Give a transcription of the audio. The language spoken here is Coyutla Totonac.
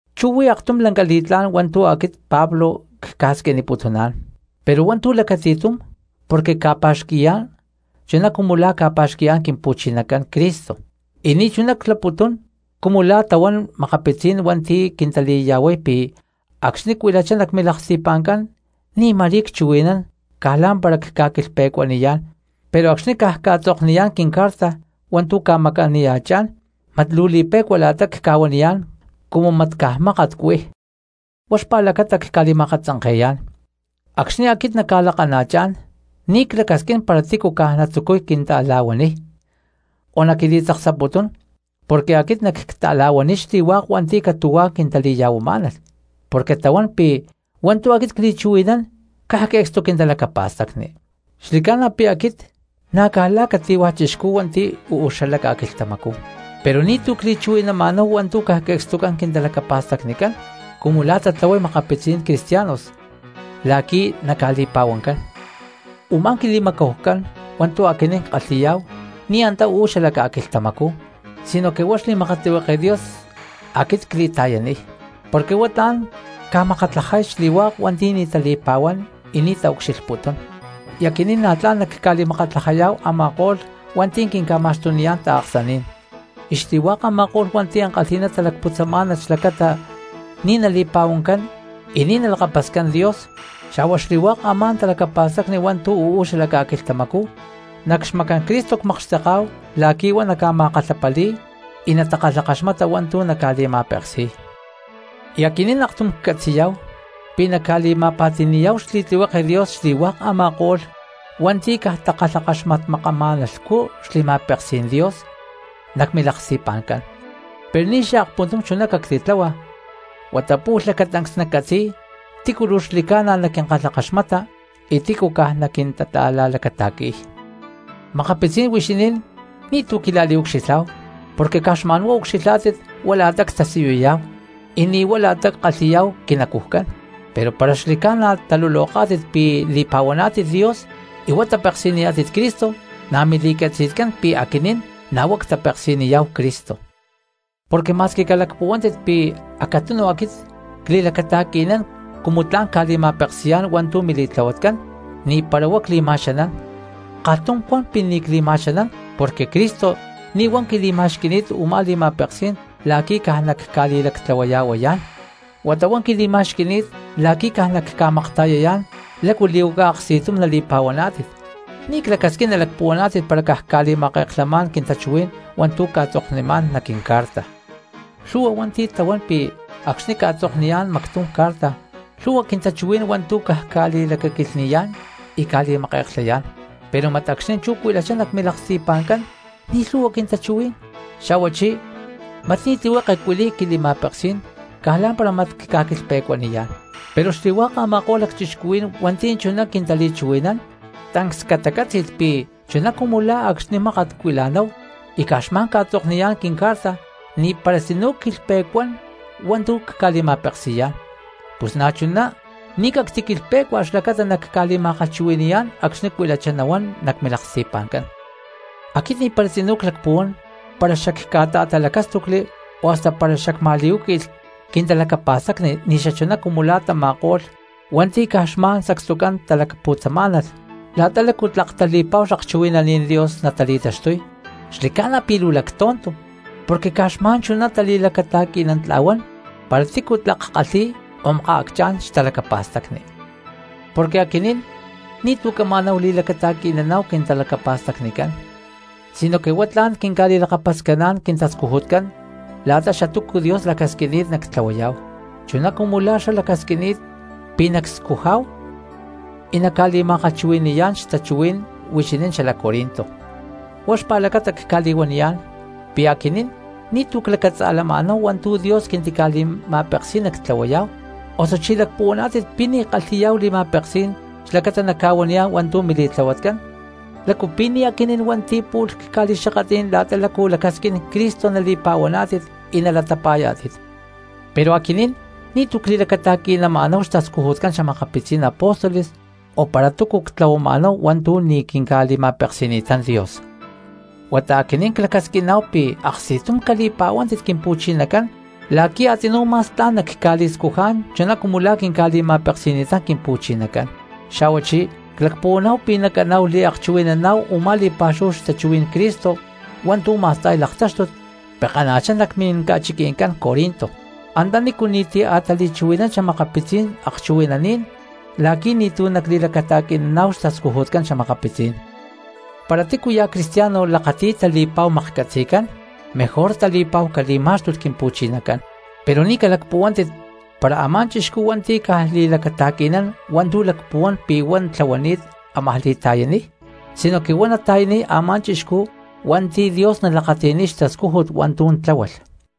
Chú huí aktum lanca li̠tlá̠n hua̠ntu̠ aquit Pablo cca̠squiniputuná̠n, pero hua̠ntu̠ lacati̠tum porque cca̠pa̠xqui̠yá̠n chuná cumu la̠ ca̠pa̠xqui̠yá̠n Quimpu̠chinacán Cristo, y ni̠chuná claputún cumu la̠ tahuán makapitzí̠n hua̠nti̠ quintali̠ya̠huay pi̠ acxni̠ cuilachá nac milaksti̠pa̠ncán ni̠ ma̠rí cchuhui̠nán caj lá̠mpara cca̠quilhpe̠cuaniyá̠n, pero acxni̠ caj cca̠tzokniyá̠n quincarta hua̠ntu̠ cca̠maca̠niya̠chán mat luu li̠pe̠cua la̠ta cca̠huaniyá̠n cumu mat caj mákat cuij. Huá xpa̠lacata cca̠li̠ma̠akatzanke̠yá̠n, acxni̠ aquit nacca̠lakana̠chá̠n ni̠ clacasquín para tícu caj natzucuy quinta̠la̠huaniy o naquili̠tzaksaputún, porque aquit nacca̠ta̠la̠huaniy xli̠hua̠k hua̠nti̠ catu̠huá quintali̠ya̠huamá̠nalh porque tahuán pi̠ hua̠ntu̠ aquit cli̠chuhui̠nán caj que̠cstu quintalacapa̠stacni. Xli̠ca̠na pi̠ aquit na̠ caj la̠ cati̠hua̠ chixcú hua̠nti̠ uú xalac ca̠quilhtamacú, pero ni̠tu̠ cli̠chuhui̠nama̠náhu hua̠ntu̠ caj que̠cstucán quintalacapa̠stacnicán cumu la̠ tatlahuay makapitzí̠n cristianos la̠qui̠ naca̠li̠pa̠huancán. Umá quili̠macahucán hua̠ntu̠ aquinín ckalhi̠yá̠hu ni̠ antá uú xala ca̠quilhtamacú sinoque huá xli̠makatlihueke Dios aquit cli̠ta̠yaniy, porque huá tla̠n ca̠makatlajay xli̠hua̠k hua̠nti̠ ni̠ tali̠pa̠huán y ni̠ taucxilhputún. Y aquinín na̠ tla̠n nacca̠li̠makatlajayá̠hu a̠ma̠ko̠lh hua̠nti̠ quinca̠ma̠xtuniyá̠n taaksaní̠n, y xli̠hua̠k a̠ma̠ko̠lh hua̠nti̠ ankalhi̠ná talacputzamá̠nalh xlacata ni̠ nali̠pa̠huancán y ni̠ nalakapascán Dios, xa̠hua xli̠hua̠k a̠má talacapa̠stacni hua̠ntu̠ uú xala ca̠quilhtamacú, nac xmacán Cristo cmakxteká̠hu la̠qui̠ huá naca̠ma̠kalhapali̠y y na̠ natakalhakaxmata hua̠ntu̠ naca̠li̠ma̠peksi̠y. Y aquinín aktum ccatzi̠yá̠hu pi̠ nacca̠li̠ma̠pa̠ti̠ni̠yá̠hu xli̠tlihueke Dios xli̠hua̠k a̠ma̠ko̠lh hua̠nti̠ caj takalhakaxmatmakama̠nalhcú xli̠ma̠peksí̠n Dios nac milaksti̠pa̠ncán. Pero ni̠ xaakpuntum chuná cactica̠tláhua huata pu̠lh lacatancs naccatzi̠y tícu luu xli̠ca̠na naquinkalhakaxmata y tícu caj naquintata̠la̠lacata̠qui̠y. Makapitzí̠n huixinín ni̠tu̠ quila̠liucxilhá̠hu porque caj xma̠nhuá ucxilhá̠tit huá la̠ta ctasiyuyá̠hu y ni̠ huá la̠ta ckalhi̠yá̠hu quinacujcán, pero para xli̠ca̠na taluloká̠tit pi̠ li̠pa̠huaná̠tit Dios y huá tapeksi̠niyá̠tit Cristo, na̠ mili̠catzi̠tcán pi̠ aquinín na̠ huá ctapeksi̠niyá̠hu Cristo. Porque ma̠squi calacpuhuántit pi̠ acatunu aquit cli̠lacata̠qui̠nán cumu tla̠n cca̠li̠ma̠peksi̠yá̠n hua̠ntu̠ mili̠tlahuatcán, ni̠para huá cli̠ma̠xanán; kalhtum cuan pi̠ ni̠ cli̠ma̠xanán porque Cristo ni̠ huá quili̠ma̠xqui̠ni̠t u̠má li̠ma̠peksí̠n la̠qui̠ caj nacca̠li̠lactlahuaya̠huayá̠n, huata huá quili̠ma̠xqui̠ni̠t la̠qui̠ caj nacca̠makta̠yayá̠n lácu li̠huaca aksti̠tum nali̠pa̠huaná̠tit. Ni̠ clacasquín nalacpuhuaná̠tit para caj cca̠li̠make̠klhamá̠n quintachuhuí̠n hua̠ntu̠ cca̠tzoknimá̠n nac quincarta. Lhu̠hua hua̠nti̠ tahuán pi̠ acxni̠ cca̠tzokniyá̠n mactum carta lhu̠hua quintachuhuí̠n hua̠ntu̠ caj cca̠li̠lacaquilhni̠yá̠n y cca̠li̠make̠klhayá̠n; pero mat acxni̠ chú cuilachá nac milaksti̠pa̠ncán ni̠ lhu̠hua quintachuhuí̠n, xa̠huachí mat ni̠ tlihueke cuili̠y quili̠ma̠peksí̠n caj lá̠mpara mat cca̠quilhpe̠cuaniyá̠n. Pero xli̠hua̠k a̠ma̠ko̠lh lacchixcuhuí̠n hua̠nti̠ chuná quintali̠chuhui̠nán tancs catacátzi̠lh pi̠ chuná cumu la̠ acxni̠ mákat cuila̠náhu y caj xma̠n cca̠tzokniyá̠n quincarta ni̠para tzinú cquilhpe̠cuán hua̠ntu̠ cca̠li̠ma̠peksi̠yá̠n, pus na̠chuná ni̠ cactiquilhpé̠cua xlacata nacca̠ma̠kalhchuhui̠ni̠yá̠n acxni̠ cuilachá nahuán nac milaksti̠pa̠ncán. Aquit ni̠para tzinú clacpuhuán para xacca̠ta̠talacástucli o hasta para xacma̠li̠huáqui̠lh quintalacapa̠stacni ni̠xachuná cumu la̠ tama̠ko̠lh hua̠nti̠ caj xma̠n sacstucán talacputzamá̠nalh la̠ta lácu tlak tali̠pa̠hu xakchuhui̠naní̠n Dios natali̠taxtuy. Xli̠ca̠na pi̠ luu lactonto porque caj xma̠n chuná tali̠lacata̠qui̠nantla̠huán para tícu tlak kalhi̠y o makaacchá̠n xtalacapa̠stacni. Porque aquinín ni̠tu̠ cama̠náhu li̠lacata̠qui̠naná̠hu quintalacapa̠stacnicán sinoque huá tla̠n quinca̠li̠lakapascaná̠n quintascujutcán la̠ta xatúcu Dios lacasquini̠t nactlahuayá̠hu, chuná cumu la̠ xlá lacasquini̠t pi̠ nacscujá̠hu y nacca̠li̠ma̠kalhchuhui̠ni̠yá̠n xtachuhuí̠n huixinín xalac Corinto. Huá xpa̠lacata cca̠li̠huaniyá̠n pi̠ aquinín ni̠tu̠ clacatza̠lama̠náhu hua̠ntu̠ Dios quintica̠li̠ma̠peksí̠n nactlahuayá̠hu; osuchí ¿lacpuhuaná̠tit pi̠ ni̠ ckalhi̠yá̠hu li̠ma̠peksí̠n xlacata nacca̠huaniyá̠n hua̠ntu̠ mili̠tlahuatcán? ¿Lácu pi̠ ni̠ aquinín hua̠nti̠ pu̠lh cca̠li̠xakatlí̠n la̠ta lácu lacasquín Cristo nali̠pa̠huaná̠tit y nalatapa̠yá̠tit? Pero aquinín ni̠tu̠ cli̠lacata̠qui̠nama̠náhu xtascujutcán xa̠makapitzí̠n apóstoles, o para túcu ctlahuamá̠náhu hua̠ntu̠ ni̠ quinca̠li̠ma̠peksi̠ni̠tán Dios. Huata aquinín clacasquiná̠hu pi̠ aksti̠tum cali̠pa̠huántit Quimpu̠chinacán la̠qui̠ a̠tzinú ma̠s tla̠n nacca̠li̠scujá̠n chuná cumu la̠ quinca̠li̠ma̠peksi̠ni̠tán Quimpu̠chinacán. Xa̠huachí clacpuhuaná̠hu pi̠ nacaná̠hu liakchuhui̠naná̠hu u̠má li̠pa̠xúhu xtachuhuí̠n Cristo hua̠ntu̠ ma̠sta̠y laktáxtut pekana̠chá nac minca̠chiqui̠ncán Corinto, antanícu ni̠ti̠ a̠ tali̠chuhui̠nán xa̠makapitzí̠n akchuhui̠naní̠n la̠qui̠ ni̠tu̠ nacli̠lacata̠qui̠naná̠hu xtascujutcán xa̠makapitzí̠n. Para tícuya̠ cristiano lakati̠y tali̠pa̠hu maklhcatzi̠cán, mejor tali̠pa̠hu cali̠má̠xtulh Quimpu̠chinacán. Pero ni̠ calacpuhuántit para a̠má chixcú hua̠nti̠ caj li̠lacata̠qui̠nán hua̠ntu̠ lacpuhuán pi̠ huá tlahuani̠t ámaj li̠ta̠yaniy; sinoque huá nata̠yaniy a̠má chixcú hua̠nti̠ Dios nalakati̠niy xtascújut hua̠ntu̠ tláhualh.